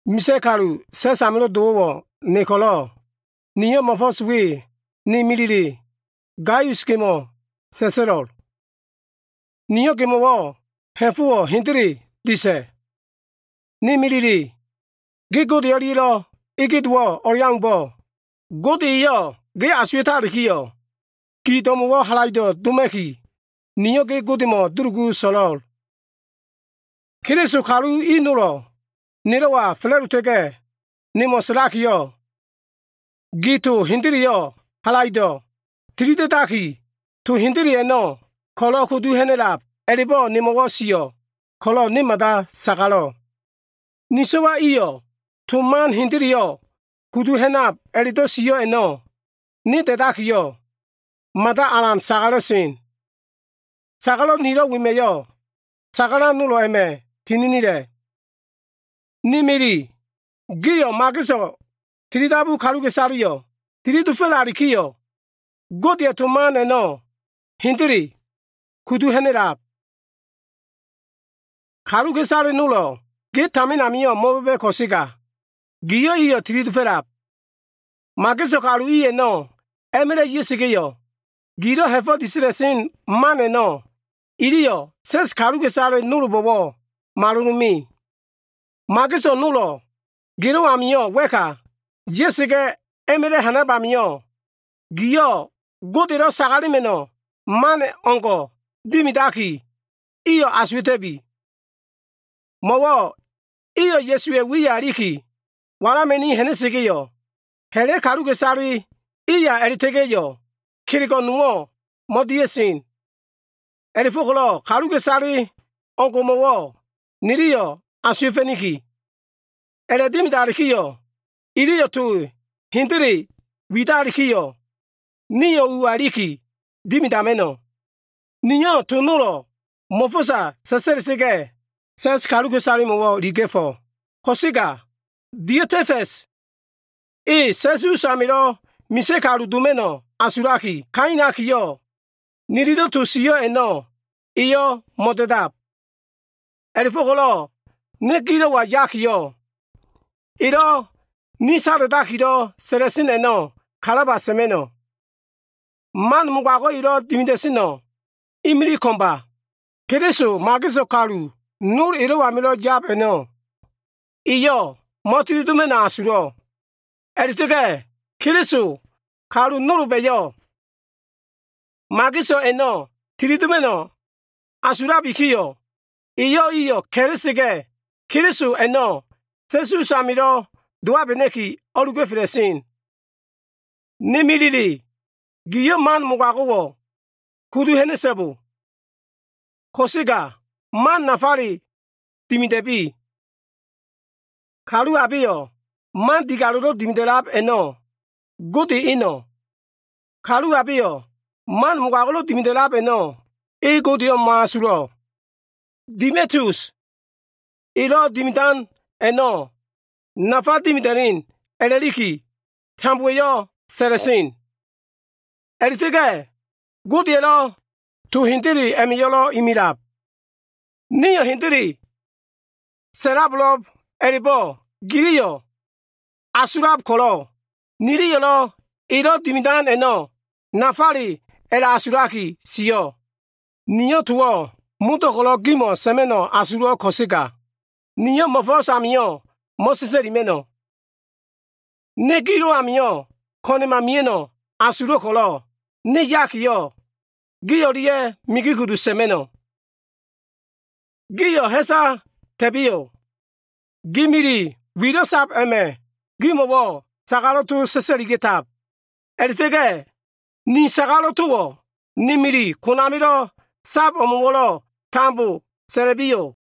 Misa꞉ kalu sa꞉s amilo꞉ dowo꞉wo꞉ ne ko꞉lo꞉, niyo꞉ mo꞉fo꞉s we ne milile Gaius gemo꞉ sa꞉sa꞉lo꞉l. Niyo꞉ gemo꞉wo꞉ ha꞉fo꞉wo꞉ hendele disa꞉. Ne milile, ge Gode o꞉lia꞉lo꞉ ege dowo꞉ o꞉leaumbo꞉, Gode eyo꞉ ge asuwa꞉talikiyo꞉, gi do꞉mo꞉wo꞉ halaido꞉ doma꞉ki, niyo꞉ ge Godemo꞉ dulugu so꞉lo꞉l. Keliso kalu i nolo꞉ nelo꞉wa fa꞉la꞉dota꞉ga꞉, nemo꞉ sa꞉lakiyo꞉, gio꞉ to hendeleyo꞉ halaido꞉ tilida꞉daki, to hendele a꞉no꞉ ko꞉lo꞉ kudu ha꞉na꞉lab, a꞉la꞉bo꞉ nemo꞉wo꞉ sio꞉ ko꞉lo꞉ ne mada sagalo꞉. Ni so꞉wa iyo꞉ to hendeleyo꞉ kudu ha꞉nab a꞉la꞉do꞉ sio꞉ a꞉no꞉ ne da꞉dakiyo꞉, mada alan sagala꞉sen. Sagalo꞉ nilo꞉ wema꞉yo꞉, sagalan nolo꞉ a꞉ma꞉ tininila꞉. Ni mili, giyo꞉ mageso꞉ tilidabu kaluka꞉isaleyo꞉ tili dofo꞉lalikiyo꞉, Godeya꞉ to nafa a꞉no꞉ hendele kudu ha꞉na꞉lab. Kaluka꞉isale nolo꞉ ge tamin amio꞉ mo꞉ba꞉ba꞉ ko꞉sega, giyo꞉ iyo꞉ tili dofo꞉lab. Mageso꞉ kalu i a꞉no꞉ a꞉ma꞉la꞉ ya꞉sa꞉ga꞉yo꞉, gilo꞉ ha꞉fo꞉ disa꞉la꞉sen man a꞉no꞉ iliyo꞉ sa꞉s kaluka꞉isale nolbo꞉wo꞉ malolo꞉ me. Mageso꞉ nolo꞉ gelo꞉ amio꞉ wa꞉ka ya꞉sa꞉ga꞉ a꞉ma꞉la꞉ ha꞉nab amio꞉, gio꞉ Godelo꞉ sagalema꞉no꞉ man o꞉ngo꞉ dimidaki, iyo꞉ asuwa꞉ta꞉bi. Mo꞉wo꞉ iyo꞉ Ya꞉suwa꞉ wiya iliki walama꞉ni ha꞉na꞉sa꞉ga꞉yo꞉, ha꞉la꞉ kaluka꞉isale iya a꞉la꞉ta꞉ga꞉yo꞉ kelego꞉ nowo꞉ mo꞉dia꞉sen. A꞉la꞉fo꞉ko꞉lo꞉ kaluka꞉isale o꞉leo꞉ngo꞉mo꞉wo꞉ niliyo꞉ asuwa꞉fa꞉niki. A꞉la꞉dimidalikiyo꞉, iliyo꞉ to hendele widalikiyo꞉, nio꞉ ua iliki dimidama꞉no꞉. Niyo꞉ to nolo꞉ mo꞉fo꞉sa sa꞉sa꞉la꞉sa꞉ga꞉, sa꞉s kaluka꞉isalemo꞉wo꞉ iliga꞉fo꞉. Ko꞉sega Diotefa꞉s, e sa꞉s usamilo꞉ misa꞉ kalu doma꞉no꞉ asulaki kailakiyo꞉, nililo꞉ to sio꞉ a꞉no꞉ eyo꞉ mo꞉da꞉dab. A꞉la꞉fo꞉ko꞉lo꞉ ne gilo꞉wa yakiyo꞉, elo꞉ ni sada꞉dakilo꞉ sa꞉la꞉sen a꞉no꞉ kalaba sa꞉ma꞉no꞉. Man mogago꞉ elo꞉ dimida꞉seno꞉ imilig ko꞉mba. Keliso mageso꞉ kalu nol elo꞉ amilo꞉ yab a꞉no꞉, eyo꞉ mo꞉tili doma꞉no꞉ asulo꞉. A꞉la꞉ta꞉ga꞉, Keliso kalu nolba꞉yo꞉ mageso꞉ a꞉no꞉ tilidoma꞉no꞉ asulabikiyo꞉, eyo꞉ iyo꞉ ka꞉la꞉sa꞉ga꞉, Keliso a꞉no꞉ sa꞉s usamio꞉ dowabena꞉ki o꞉luga꞉fela꞉sen. Ni milile, giyo꞉ man mogago꞉wo꞉ kudu ha꞉na꞉so꞉bo. Ko꞉sega man nafale dimida꞉bi. Kalu abeyo꞉ man digalo꞉lo꞉ dimida꞉lab a꞉no꞉, Gode Eno꞉. Kalu abeyo꞉ man mogago꞉lo꞉ dimida꞉lab a꞉no꞉, e Godeyo꞉ mo꞉asulo꞉. Demitius elo꞉ dimidan a꞉no꞉ nafa dimida꞉len a꞉la꞉liki tambowa꞉yo꞉ sa꞉la꞉sen. A꞉la꞉ta꞉ga꞉ Godeya꞉lo꞉ to hendele a꞉ma꞉yo꞉lo꞉ imilab. Nio꞉ hendele sa꞉labo꞉lo꞉b a꞉la꞉bo꞉ giliyo꞉ asulab ko꞉lo꞉, niliyo꞉lo꞉ elo꞉ dimido꞉ a꞉no꞉ nafale a꞉la꞉asulaki sio꞉. Niyo꞉ towo꞉ modo꞉ ko꞉lo꞉ gimo꞉ sa꞉ma꞉no꞉ asulo꞉l ko꞉sega, niyo꞉ mo꞉fo꞉s amio꞉ mo꞉sa꞉sa꞉lima꞉no꞉. Ne gilo꞉ amio꞉ ko꞉na꞉ma mia꞉no꞉ asulo꞉ ko꞉lo꞉ ne yakiyo꞉, gio꞉ o꞉lia꞉ migi kudu sa꞉ma꞉no꞉. Giyo꞉ ha꞉sa ta꞉biyo꞉. Gi mili wilo꞉ sab wema꞉yo꞉ sagalo꞉ towo꞉ gimo꞉ saga꞉tab. A꞉la꞉ta꞉ga꞉ ni sagalo꞉ towo꞉ ne mili konamilo꞉ sab imo꞉wo꞉ tambo sa꞉la꞉biyo꞉.